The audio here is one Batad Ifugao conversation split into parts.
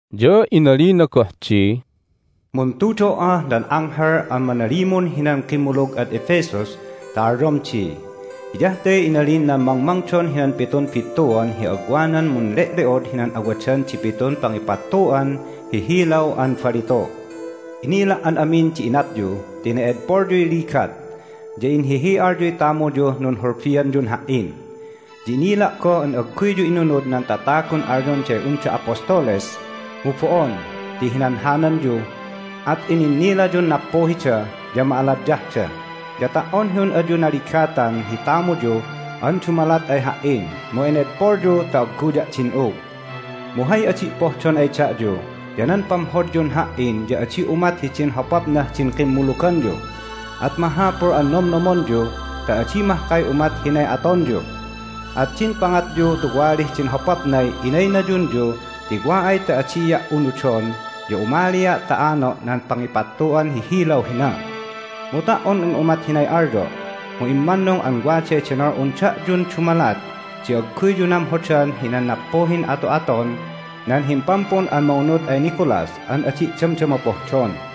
Ya inalina goh di, "Muntudo"ah nan anghel an manalimun hinan kimmulug ad Ephesus ta alyom di: Hiyah te inalin nan mangmangdon hinan pitun bittuan hi agwanan munle'le'od hinan awadan di pitun pangipattu'an hi hilaw an balitu'. Inila' an amin di inatyu ti ene'edpolyuy ligat, ya inhihi'alyuy tamuyuh nunhulbianyun Ha"in. Ya inila' goh an agguyyu inunud nan tatagun alyonday unda apostoles mu bo'on ti hinanhananyu, at ininnilayun nappuhida ya ma'aladyahda. Ya ta"on hi un ayu naligatan hi tamuyu an dumalat ay Ha"in mu enedpolyu ta agguya' din'ug. Mu hay adi' pohdon ay da'yu ya nan pamhodyun Ha"in ya adi umat hidin hopapnah din kimmuluganyu. At mahapul an nomnomonyu ta adi mahkay umat hinay atonyu! At din pangatyu tuwalih din hopapnay inaynayunyu ti wa ay ta adia' unudon ya umalia' ta ano' nan pangipattu'an hi hilaw hina. Mu ta"on un umat hinay alyo' mu immannung an waday denol'un da'yun dumalat di agguyyu namhodan hinan nappuhin ato'aton nan himpampun an mangunud ay Nicolas an adi' damdama pohdon.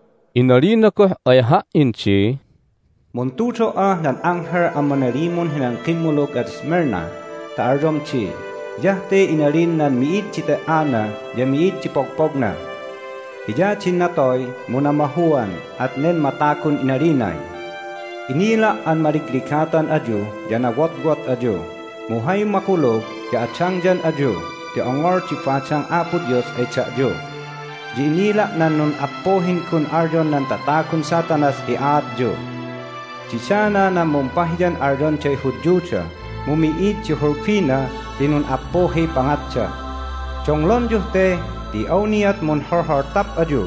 Inalina goh ay ha"in di, "Muntudo"ah nan anghel an manalimun hinan kimmulug ad Smyrna ta alyom di: Hiyah te inalin nan Mi'id di Te"ana ya Mi'id di Pogpogna. Hiya din natoy, mu namahuan, at nen matagun inalinay, Inila' an maligligatan ayu ya nawotwot ayu, mu hay makulug ya adangyan ayu ti ongol di badang Apo Dios ay da'yu. Ya inila' nan nun'appuhin gun alyon nan tatagun Satanas hi aatyu. Didana nan mumpahiyan alyonday Hudyuda, mu mi'id di hulbina ti nun'appuhiy pangatda. Donglonyuh te ti awniat munholholtap ayu,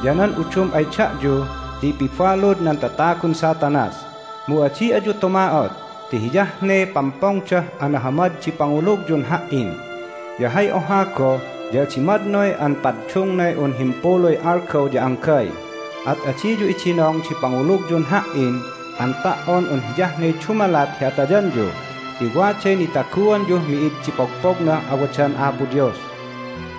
ya nan udum ay da'yu ya ipibalud nan tatagun Satanas. Mu adi ayu tuma'ot ti hiyah ne pampongdah anahamad di pangulugyun Ha"in, ya hay oha goh ya adi madnoy an paddungnay un himpuluy algaw ya anggay. At adiyu idinong di pangulugyun Ha"in an ta"on un hiyah ne dumalat hi atayanyu ti waday nitaguanyuh mi'id di pogpognah awadan Apo Dios.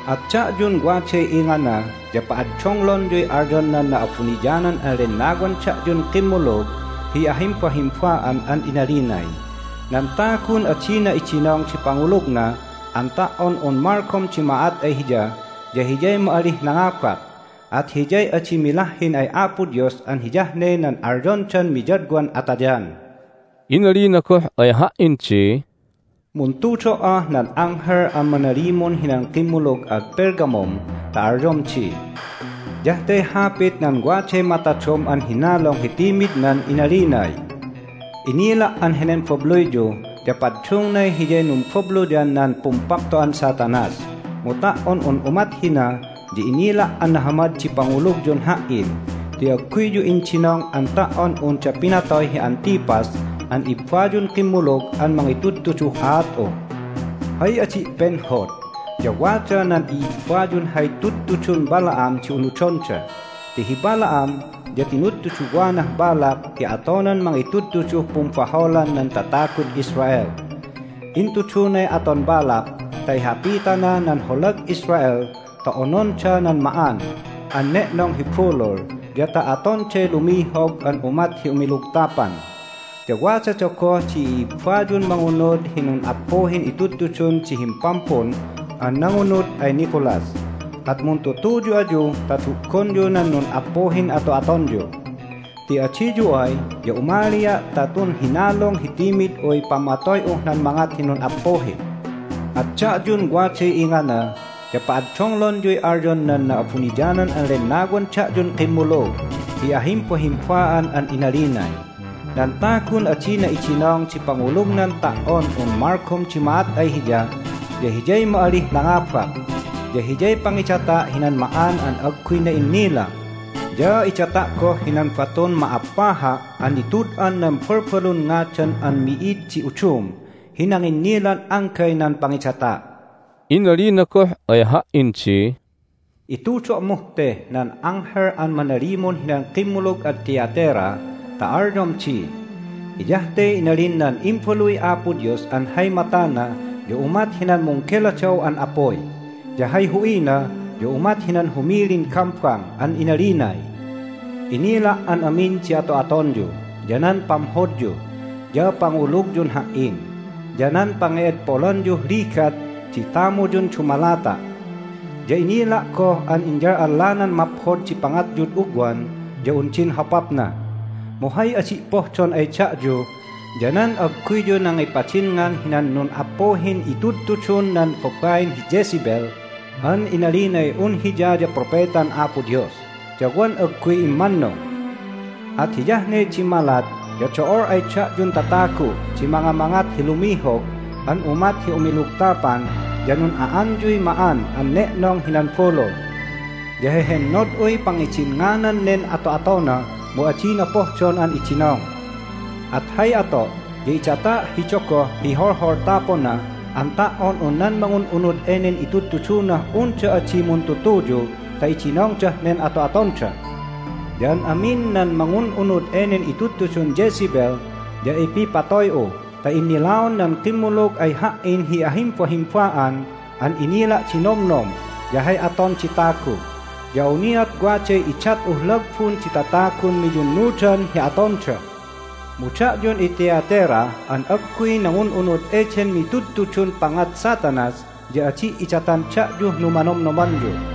At da'yun waday ingana ya pa'addonglonyuy alyon nan Na'abuniyanan an Lennawan da'yun kimmulug hi ahimbahimba'an an inalinay, Nan tagun adina idinong di pangulugna an ta"on un malgom di ma'at ay hiya ya hiyay ma'alih nangabak, at hiyay adi milahhin ay Apo Dios an hiyah ne nan alyondan miyadwan atayan." Inalina goh ay ha"in di, "Muntudo"ah nan anghel an manalimun hinan kimmulug ad Pergamum ta alyom di: Hiyah te hapit nan waday matadom an hinalung hi timidnan inalinay, Inila' an henen babluyyu ya paddungnay hiyay numbabluyan nan pumpapto'an Satanas. Mu ta"on un umat hina ya inila' an nahamad di pangulugyun Ha"in ti agguyyu indinong an ta"on unda pinatoy hi Antipas an ibbayun kimmulug an mangitudtuduh aat'u. Hay adi' penhod ya wada nan i'ibbayun hay tudtudun Balaam di unudonda. Ti hi Balaam ya tinudtuduwanah Balak hi atonan mangitudtuduh pumbaholan nan tatagud Israel. Intudunay aton Balak ta ihapitana nan holag Israel ta ononda nan ma'an an ne'nong hi bulul ya ta atonday lumihog an umat hi umilugtapan. Ya wadada goh di i'ibbayun mangunud hi nun'appuhin itudtudun di himpampun an nangunud ay Nicolas. At muntutuyu ayu ta du'gonyu nan nun'appuhin ato'atonyu. Ti adiyu ay ya umalia' ta tun hinalung hi timid'uy pamatoy'uh nan mangat hi nun'appuhi. At da'yun waday ingana ya pa'addonglonyuy alyon nan Na'abuniyanan an Lennawan da'yun kimmulug hi ahimbahimba'an an inalinay, Nan tagun adina idinong di pangulugnan ta"on un malgom di ma'at ay hiya ya hiyay ma'alih nangabak, ya hiyay pangidata' hinan ma'an an agguy na'innila, ya idata' goh hinan batun ma'appaha' an nitud'an nan balbalun ngadan an mi'id di udum hi nanginnilan anggay nan pangidata'." Inalina goh ay ha"in di, "Itudo'muh teh nan anghel an manalimun hinan kimmulug ad Thyatira ta alyom di: Hiyah te inalin nan Imbaluy Apo Dios an hay matana ya umat hinan munggeladaw an apuy, ya hay hu'ina ya umat hinan humilin gambang. An inalinay, Inila' an amin di ato'atonyu, ya nan pamhodyu, ya pangulugyun Ha"in, ya nan pange'edpolanyuh ligat di tamuyun dumalata'. Ya inila' goh an inyal'allanan maphod di pangatyud ugwan ya un din hopapna. Mu hay adi' pohdon ay da'yu ya nan agguyyu nangipadinngan hinan nun'appuhin itudtudun nan babain hi Jezebel an inalinay un hiya ya propetan Apo Dios, ya wan agguy immannung. At hiyah ne dimmalat ya do'ol ay da'yun tatagu' di mangamangat hi lumihog an umat hi umilugtapan ya nun'a'anyuy ma'an an ne'nong hinan bulul. Ya hehennod'uy pangidinnganan nen ato'atona, mu adina pohdon an idinong. At hay ato' ya idata' hi dogoh hi holholtapona an ta"on un nan mangun'unud enen itudtudunah unda adi muntutuyu ta idinongdah nen ato'atonda. Ya an amin nan mangun'unud enen itudtudun Jezebel ya ipipatoy'u ta innilaon nan kimmulug ay Ha"in hi ahimbahimba'an an inila' di nomnom ya hay aton di tagu. Ya awniat waday idat'uh lagbun di tatagun miyunnudan hi atonda. Mu da'yun iThyatira an agguy nangun'unud eden mitudtudun pangat Satanas ya adi' idatan da'yuh numanomnomanyu.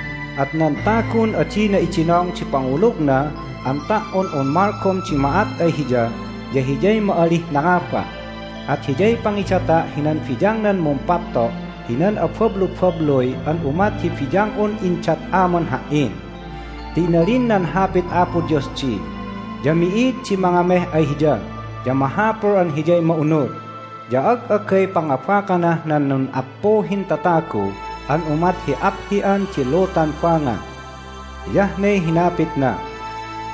At nan tagun adina idinong di pangulugna an ta"on un malgom di ma'at ay hiya ya hiyay ma'alih nangabak, at hiyay pangidata' hinan biyangnan mumpapto' hinan abablubabluy an umat hi biyang'un indat Aman Ha"in. Ti inalin nan Hapit Apo Dios di, Ya mi'id di mangameh ay Hiya, ya mahapul an Hiyay ma'unud, ya ag'agay pangabakanah nan nun'appuhin tatagu an umat hi aphi'an di lutan banga. Hiyah ne hinapitna.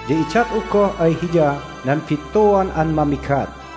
Ya idat'u goh ay hiya nan bittuan an mamigat.